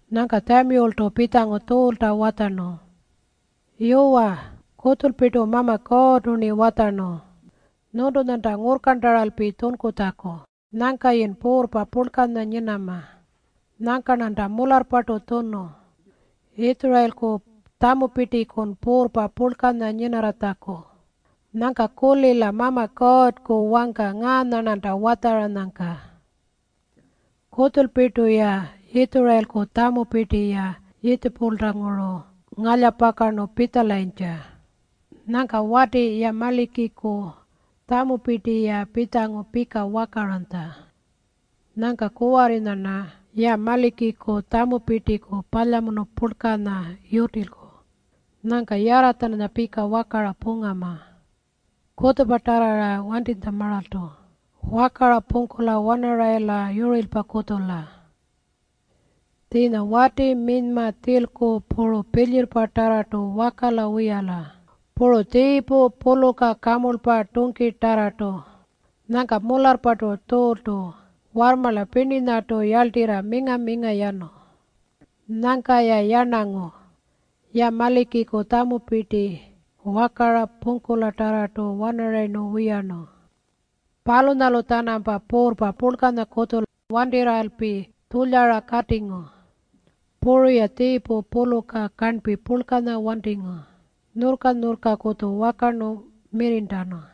Nyangka Tjamiyultu pitjangu Tjuulta watjarnu, “Yuwa, kutjulpirtu Mama Kuurrtu-rni watjarnu nyuntunyanta ngurrkarntaralpi tjunkutjaku nyangkayin puurrpa purlkanya nyinama. Nyangka-rnanta mularrpartu tjunu Yitjurayilku tjamupirtikun puurrpa purlkanya nyinarratjaku. Nyangka kulila Mama Kuurrku wangka ngaanya-rnanta watjaranyangka. ‘Kutjulpirtu Yitjurayilku tjamupirti-ya Yiitjipulanguru ngalyapakarnu pitjalayintja. Nyangka wati Yamalikiku tjamupirti-ya pitjangu pika wakaranytja. Nyangka kuwarrinya-rna Yamalikiku tjamupirtiku palyamunu purlkanya yutilku. Nyangka yarra-tjananya pika wakara pungama. Kutjupa tjarrara wantinytjamaaltu wakara pungkula-wanarayila yurirlpakutjula. Tjiinya wati, minyma, tjilku, puru pilyirrpatarrartu wakala wiyala puru tjiipu, puluka, kamurlpa puru tungkitarrartu.’” Nyangka mularrpartu Tjuultu warrmarla pirninyartu yarltirra minga-minga yanu. Nyangka-ya yarnangu Yamalikiku tjamupirti wakara pungkulatarra wanarayirnu wiyarnu. Palunyalu-tjanampa puurrpa purlkanyakutju wantirralpi tjulyara katingu. Puru-ya tjiipu puluka karnpi purlkanya wantingu, nyurrka-nyurrkakutju wakarnu mirrirntanu.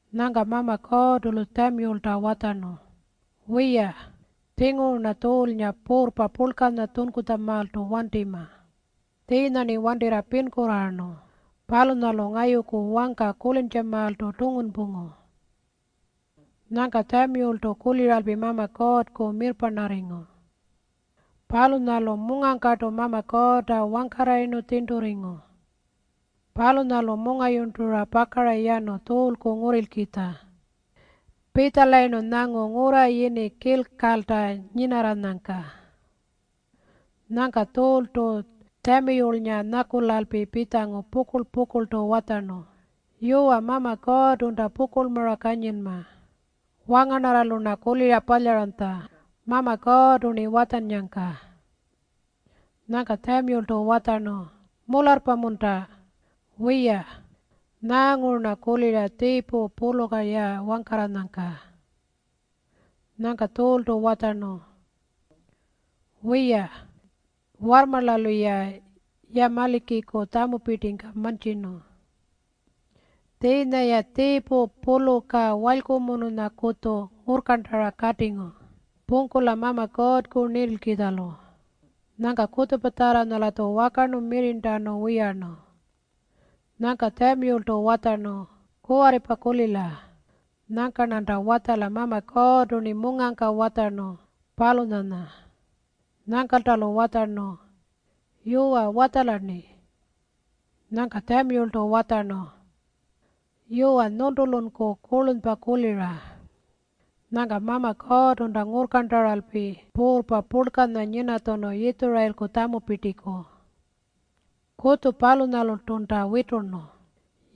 Nyangka Mama Kuurrtu-lu Tjamiyulta watjarnu, “Wiya, tjinguru-rna Tjuulnga puurrpa purlkanya tjunkutjamaaltu wantima. Tjiinya-rni wantirra pinkurraarnu palunyalu ngayuku wangka kulintjamaaltu tungunpungu.” Nyangka Tjamiyultu kuliralpi Mama Kuurrku mirrparnarringu. Palunyalu mungangkartu Mama Kuurrta wangkarrayirnu tjirnturringu. Palunyalu mungayurntura pakara yanu Tjuulku ngurrilkitja. Pitjalayirnu nyangu ngurra yini Kilkalta nyinarranyangka. Nyangka Tjuultu Tjamiyulnga nyakulalpi pitjangu pukurl-pukurltu watjarnu, “Yuwa, Mama Kuurrtunta pukurlmara kanyinma. Wangarnarralu-rna kulira palyaranytja Mama Kuurrtu-rni watjannyangka.” Nyangka Tjamiyultu watjarnu, “Mularrpa-munta? Wiya, nyaanguru-rna kulira tjiipu, puluka-ya wangkarranyangka?” Nyangka Tjuultu watjarnu, “Wiya, warrmarlalu-ya Yamalikiku tjamupirtingka mantjirnu. Tjiinya-ya tjiipu puluka walykumunukutju ngurrkarntara katingu pungkula Mama Kuurrku nintilkitjalu. Nyangka kutjupatjarranya-latju wakarnu mirrirntanu wiyarnu.” Nyangka Tjamiyultu watjarnu, “Kuwarripa kulila. Nyangka-rnanta watjala Mama Kuurrtu-rni mungangka watjarnu, palunyanya.” Nyangkalta-lu watjarnu, “Yuwa, watjala-rni.” Nyangka Tjamiyultu watjarnu, “Yuwa, nyuntulunku kurlunypa kulira. Nyangka Mama Kuurrtunta ngurrkarntaralpi puurrpa purlkanya nyinatjunu Yitjurayilku tjamupirtiku. Kutju-palunyalurtunta witurnu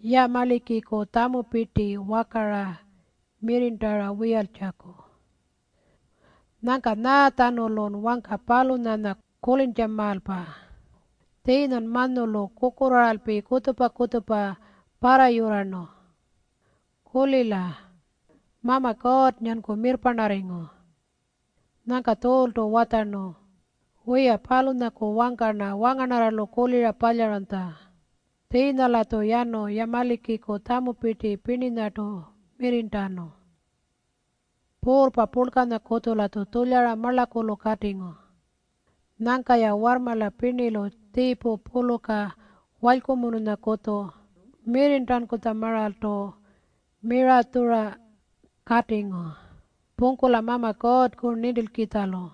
Yamalikiku tjamupirti wakara mirrirntara wiyaltjaku. Nyangka nyaatjanulun wangka palunyanya kulintjamaalpa? Tjiinyan manyulu kukurraaralpi kutjupa-kutjupa parrayurrarnu. Kulila. Mama Kuurrnganku mirrparnarringu.” Nyangka Tjuultu watjarnu, “Wiya, palunyaku wangka-rna wangarnarralu kulira palyaranytja. Tjiinya-latju yanu Yamalikiku tjamupirti pirninyartu mirrirntanu. Puurrpa purlkanyakutju-latju tjulyara marlakulu katingu. Nyangka-ya warrmarla pirnilu tjiipu puluka walykumununyakutju mirrirntankutjamaaltu miratjura katingu pungkula Mama Kuurrku nintilkitjalu.”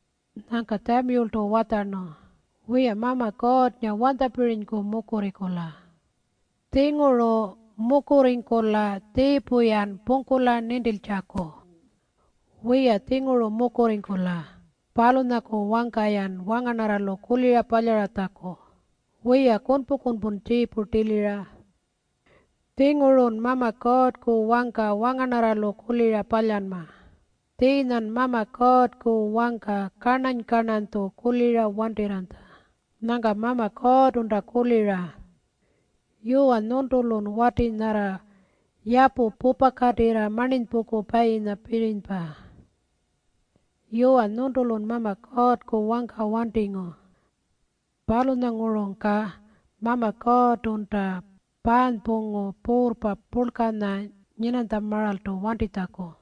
Nyangka Tjamiyultu watjarnu, “Wiya, Mama Kuurrnga wanytjapirinyku mukurringkula? Tjinguru mukurringkula tjiipu-yan pungkula nintiltjaku. Wiya, tjinguru mukurringkula palunyaku wangka-yan wangarnarralu kulira palyaratjaku. Wiya, kunpu-kunpun tjiipu tilira. Tjingurun Mama Kuurrku wangka wangarnarralu kulira palyanma. Tjiinyan Mama Kuurrku wangka karnany-karnanytju kulira wantirranytja. Nyangka Mama Kuurrtunta kulira, ‘Yuwa nyuntulun wati nyarra yapu pupakatirra marninypungkupayinyapirinypa.’ Yuwa, nyuntulun Mama Kuurrku wangka wantingu. Palunyangurungka Mama Kuurrtunta paanypungu puurrpa purlkanya nyinanytjamaaltu wantitjaku.”